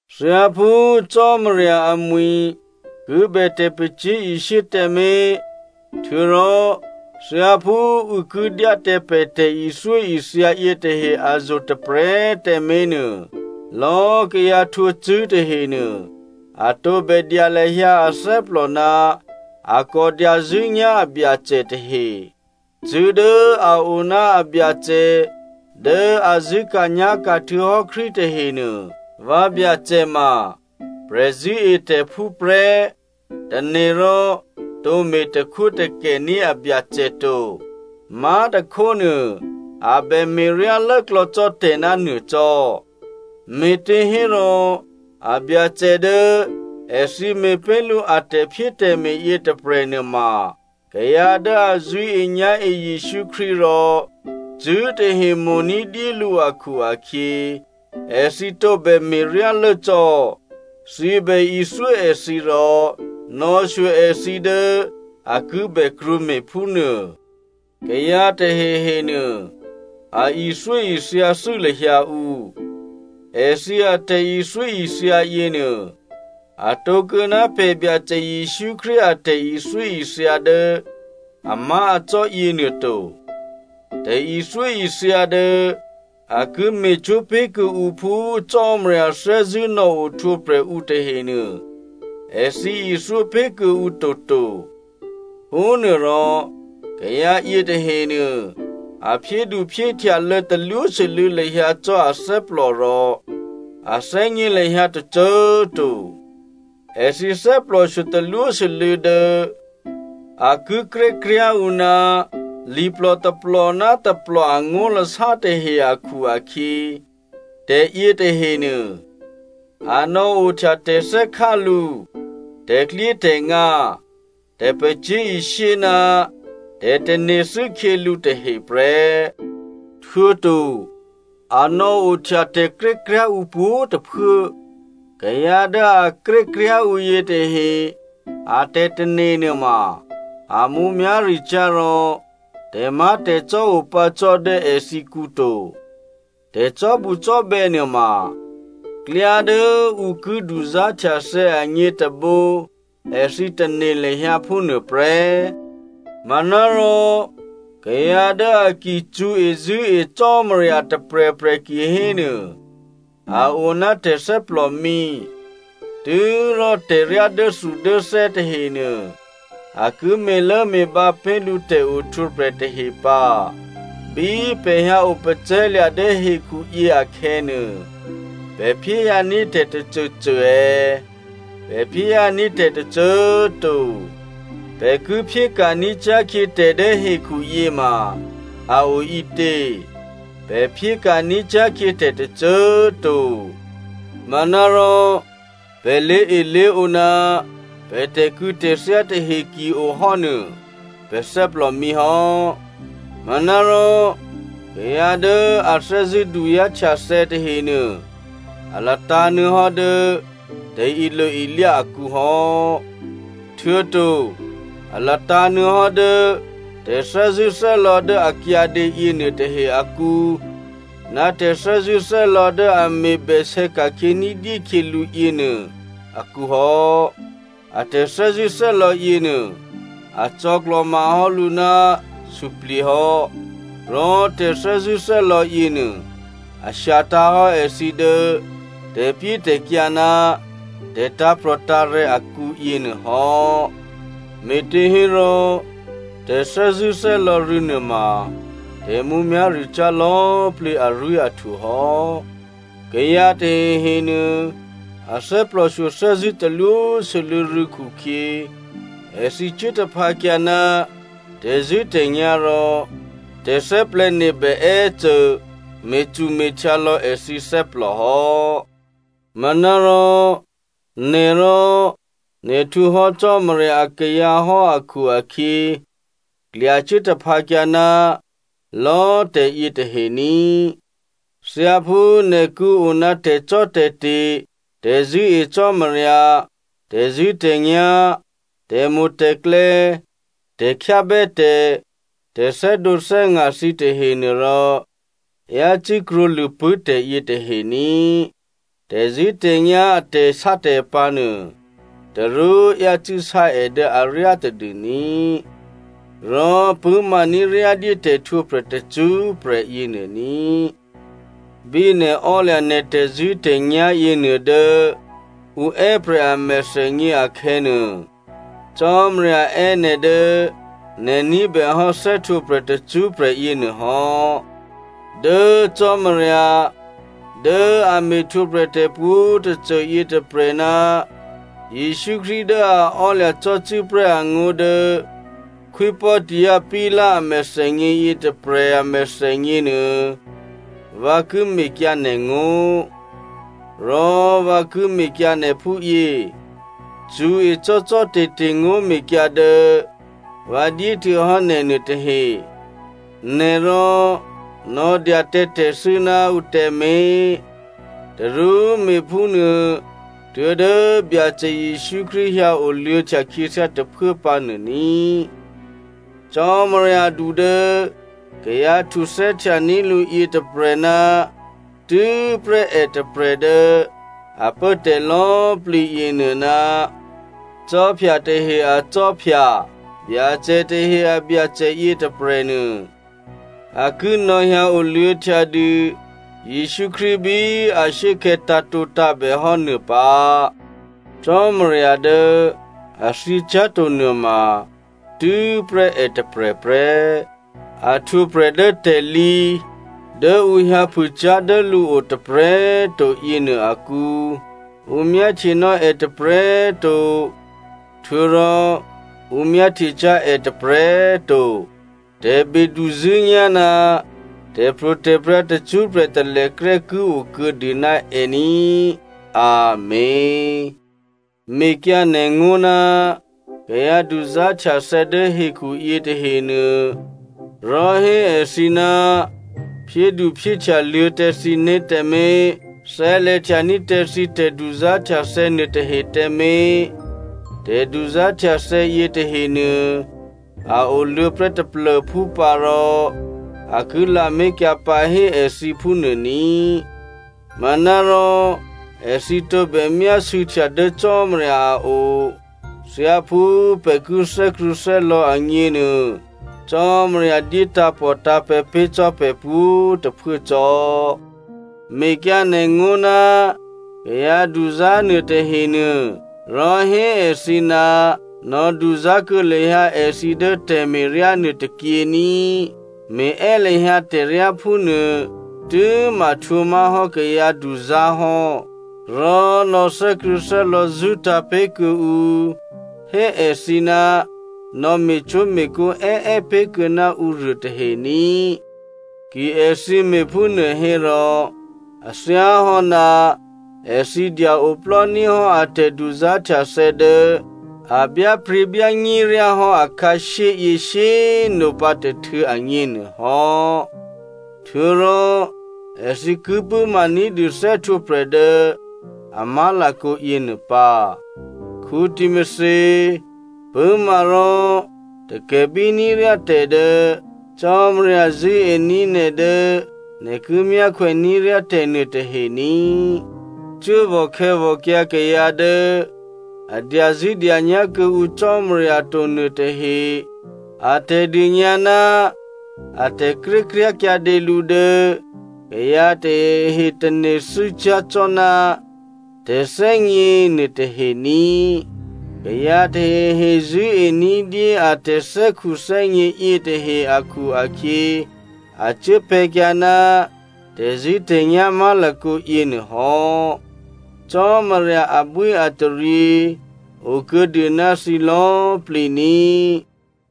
Thyáphú Cò́marya amwi̤ ki bè tè̤pacyé̤ishyé tǎmé̤, htuô̌rò thyáphú ǔ ki dyá tǎ pè̤ tè̤ithyóithya yětahe azo̤ tôprè̤꤮ tǎmé̤ nuô, lò̌꤮ kayǎ htwǒcṳ̂́ tahenuô, a tǒbè dya lahyǎ athè́plò ná a kò dyazṳ̂́nyá̤ abyacè tahe. Cṳ̂́ dố a o ná abyacè dố a zṳ̂́ka̤nyá̤ka̤ htuô̌hò́ Krístu tahenuô, vǎbyacè ma prè̤zṳ̂́etè̤phú prè́ tane̤ rò tǒ me̤takhwótakè ní̤ abyacè to. Má̤tôkhónuô, a bè me̤ryá lốklò̌ cò́ tè̤ ná nuô cò́, me̤těhérò abyacè dố èthǐ me̤pé̤ lǔ a tè̤phyétè̤me̤ yětôprè̤ nuôma kayǎ dố a zṳ̂́enyá̤e Jesǔ Krístu rò cṳ̂́tahe mo̤ ní̤dyé lǔ akhu-akhyě, èthǐ tǒbè me̤ryá lốcò́. Thǐbè ithyó èthǐ rò nò̌shyo èthǐ dố a ki bè krwǒme̤ phúnuô. Kayǎ tahehe nuô a ithyóithya thû́ lahyǎ ǔ. Èthǐ atè̤ithyóithya yěnuô, atǒ kuô̌ ná pè̤ Byacè Jesǔ Krístu a tè̤ithyóithya dố amá̤acò́ yěnuô to. Tè̤ithyóithya dố a ki me̤cwó̤ pé̤ kuô̌ǔ phú Cò́marya thè́zṳ̂́ nò̌ ohtwǒprè̤ ǔ tahenuô èthǐ ithyó pé̤ kuô̌ǔ toto. Phúnuôrò kayǎ yětahenuô, a phyédu phyéhtyalô̌ talwósû́lû̌ lahyǎ cò́ athè́plò rò a thè́gně lahyǎ tôcô꤮ to. Èthǐ thè́plòshyo talwósû́lû̌ dố a ki krékryá̤ ǔ ná liplò tôplò ná tôplò angó̤lasá tahe akhu-akhyě, tè̤yětahenuô, a nò̌ohtya tè̤thè́khá lǔ, tè̤klyétè̤ngǎ, tè̤pacyé̤ishyé, ná tè̤tane̤thû́ khyělǔ tahe prè́. Htuô̌to, a nò̌ohtya tè̤krékryá̤ ǔ pwǒ̤꤮ tôphuố. Kayǎ dố a krékryá̤ ǔ yětahe a tè̤tane̤ nuôma a mǔmyá̤ricyá̤ rò tè̤má̤tè̤cò́ opǎ cò́ dố èthǐkǔ to. Tè̤cò́bucò́bè̌ nuôma klyá dố ǔ ki duzá̤htyathè̌ agně tôbǒ èthǐ tane̤ lahyǎ phúnuô prè́. Manárò, kayǎ dố a ki cṳ̌ezṳ̂́e Cò́marya tôprè̤prè̤ kihénuô a o ná tè̤thè́plòmǐ. Tû́rò tè̤ryá dốthudốthè́ tahenuô a ki me̤lốme̤bǎ pé̤ lǔ tè̤ohtwǒprè̤ tahe pǎ. Bí pè̤ hyǎ opacè̤̌lya̤ dố hekhuyě akhè̌nuô, pè̤ phyéhyǎní̤ tè̤ tôcôcô è̌? Pè̤ phyéhyǎní̤ tè̤ tôcô꤮ to. Pè̤ ki phyéka̤ní̤ cyá̤khyě tè̤dố hekhu yěma a o ǐtě? Pè̤ phyéka̤ ní̤cyá̤khyě tè̤ tôcô꤮ to. Manárò, pè̤ lé̤elé̤ǒ ná pè̤ tè̤kû̌tè̤thyá tahe ki-ohò́ nuô, pè̤ thè́plò mǐhò́. Manárò kayǎ dố a thè́zṳ̂́ duzá̤htyathè̌ tahenuô, a latǎ̤nuô̌hò́ dố tè̤ilo-ilyá akǔhò́, htuô̌to a latǎ̤ nuô̌hò́ dố tè̤thè́zṳ̂́thè́lò̌ dố a kyǎdě yěnuô tahe akǔ ná tè̤thè́zṳ̂́thè́lò̌ dố a me̤bèsè̌ ka̤khyě ní̤dyé khyě lǔ yěnuô akǔ hò́. A tè̤thè́zṳ̂́thè́lò̌ yěnuô a cò̌klò̤mahò́ lǔ ná suplye̤ hò́. Rò tè̤thè́zṳ̂́thè́lò̌ yěnuô a shyatǎ̤hò́ èthǐ dố tè̤pyétè̤kyǎ ná tè̤tǎ̤prò̤tǎ̤rè̤̌ akǔ yěnuôhò́. Me̤těhérò tè̤thè́zṳ̂́thè́lò̌ rû̌ nuôma tè̤mǔmyá̤ricyá̤ lò̌꤮ plǐ arwí̤ahtwo hò́. Kayǎ tahehe nuô, a thè́plòshyo thè́zṳ̂́ talwósû́lû̌ rû̌ khukhyě, èthǐ cuố taphǎkyǎ ná tè̤zṳ̂́tè̤nyá̤ rò tè̤thè́plè̤̌nebè è́cô me̤cume̤htyǎ lò̌ èthǐ thè́plòhò́. Manárò nè̤ rò nè̤ htwǒhò́ Cò́marya akayǎ hò́ akhu-akhyě, klyacuố taphǎkyǎ ná lò̌꤮ tè̤yě tahe ní꤮. Thyáphú nè̤ ki o ná tè̤cò́tè̤te̤, tè̤zṳ̂́e Cò́marya, tè̤zṳ̂́tè̤nyá̤, tè̤mo̤tè̤klè̌, tè̤khyábè́tè̤, tè̤thè́dǒthè́nga̤ thǐ tahenuô rò yácû́ krwǒlṳ̂pṳ̂́ tè̤yětahe ní꤮. Tè̤zṳ̂́tè̤nyá̤ a tè̤sátè̤pǎ̤ nuô tarú yácû́ sá è dố aryá tadû ní꤮, rò pṳ̂́maní̤ ryá dyé tè̤htwǒprè̤ tacṳ́prè̤ yěnuô ní꤮. Bí nè̤ ò́lya̤ nè̤ tè̤zṳ̂́tè̤nyá̤ yěnuô dố ǔ è́prè̤ a mèthènyě akhè̌nuô, Cò́marya è́ nè̤ dố nè̤ ní̤bèhò́ thè́htwǒprè̤ tacṳ́prè̤ yěnuô hò́. Dố Cò́marya dố a me̤htwǒprè̤ tè̤pwǒ̤tôcô yětôprè̤ ná Jesǔ Krístu dố a ò́lya̤ cò́cû́prè́ angó̤ dố Khwí Pòntio Pilato a mèthènyě yětôprè̤ amèthènyěnuô, vǎ ki mekyǎ nè̤ngó̤. Rò vǎ ki mekyǎ nè̤ phúyě, cṳ̌e cò́cò́te̤te̤ ngó̤mekyǎ dố vǎ dyéhtuô̌hò́ nè̤nuô tahe. Nè̤rò nò̌dya tǎ tè̤thû́ ná ǔ tǎmé̤. Tarú me̤phúnuô tuố̤dố Byacè Jesǔ Krístu hyǎoluô̌htya khyěthyá tôphuố pǎ nuô ní꤮. Cò́maryadu dố kayǎ htuthè́htyaní̤ lǔ yětôprè̤ ná tû́prè́ è tôprè̤ dố a pố tè̤ lò̌꤮ plǐ yěnuô, ná khwí tahe a Khwí, Byacè tahe a Byacè yětôprè̤nuô, a ki nò̌hyǎ oluô̌htya dû Jesǔ Krístu bí ashuốkhè̌ tǎ̤tǒtǎ̤bè hò́ nuô pǎ. Cò́marya dố a thyěcyá̤to nuôma tû́prè́ è tôprè̤ prè́. A htwǒprè̤ dố tè̤lǐ, dố ǔ hyǎphûcyá̤ dố lǔo tôprè̤꤮ to yěnuô akǔ. Ǔ myáhtyenò́ è tôprè̤꤮ to htuô̌rò ǔ myáhtyecyá̤ è tôprè̤꤮ to. Tè̤beduzṳ̂́nyá̤ ná tè̤pro̤tè̤prya̤ tacṳ́prè̤ talèkrè́ ki o kuô̌dû ná è ní꤮ Amèn. Mekyǎ nè̤ngó̤ ná kayǎ duzá̤htyathè̌ dố hekhu yětahenuô, rò hé èthǐ ná phyéduphyéhtyaluô̌ tǎ thǐné̤ tǎmé̤, thè́lè̤htya ní̤ tǎ thǐ tè̤duzá̤htyathè̌ nuôtahe tǎmé̤. Tè̤duzá̤htyathè̌ yětahenuô, a oluô̌ prè́ taplô̤phú pǎ rò a ki lamé̤kyǎ pǎ hé èthǐ phúnuô ní꤮. Manárò èthǐ tǒbè myásû̌htya dố Cò́marya a o. Thyáphú pè̤ ki thè́krṳ̂̌thè́lò̌ agněnuô, Cò́marya dyé tǎ̤pòtǎ̤pè̤̌ pé̤ cò́ pè̤ pwǒ̤꤮ tôphuố cò́. Mekyǎ nè̤ngó̤ ná kayǎ duzá̤ nuôtahe nuô, rò hé èthǐ ná nò̌duzá̤ kuô̌ lahyǎ èthǐ dố tè̤me̤ryá nuô tôkyě ní꤮. Me̤è́ lahyǎ tè̤ryá phúnuô tû́ma htwǒmá̤hò́ kayǎduzá̤ hò́. Rò nò̌ thè́krṳ̂̌thè́lò̌ zṳ́tǎ̤ pé̤kuô̌ ǔ, hé èthǐ ná nò̌me̤cwó̤me̤kǒ è́è́ pé̤kuô̌ ná ǔruô tahe ní꤮. Ki èthǐ me̤phúnuô hérò, a thyáhò́ ná èthǐ dya-oplò́ ní̤ hò́ a tè̤duzá̤htyathè̌ dố a byápryě̤byányéryá hò́ akhǎshyéyě shyé꤮ nopǎ tôhtû̌ agněnuôhò́. Htuô̌rò èthǐ ki pṳ̂́ma ní̤dû thè́htwǒprè̤ dố a má̤lakǒ yěnuô pǎ. Timothy꤮ pṳ̂́ma rò takè̤bíní̤ ryá tè̤ dố Cò́marya zṳ̂́ení̤ nè̤ dố nè̤ ki myákhwè ní̤ ryá tè̤nuôtahe ní꤮. Cuốvò̤ khè̌vò̤kyǎ kayǎ dố a dyazṳ̂́dyanyá̤ kuô̌ǔ Cò́marya to nuôtahe a tè̤dônyǎ ná a tè̤krékryá̤ kyǎdě lǔ dố kayǎ tahehe tane̤thû́ cyá̤ cò́ ná “tè̤thè́gně” nuôtahe ní꤮. Kayǎ tahehe zṳ̂́e ní̤dyé a tè̤thè́khuthè́gně yětahe akhu-akhyě, a cuốpè̤̌kyǎ ná tè̤zṳ̂́tè̤nyá̤ má̤lakǒ yěnuô hò́. Cò́marya abwíataryě okuô̌dû ná thǐ lò̌꤮ plǐ ní꤮.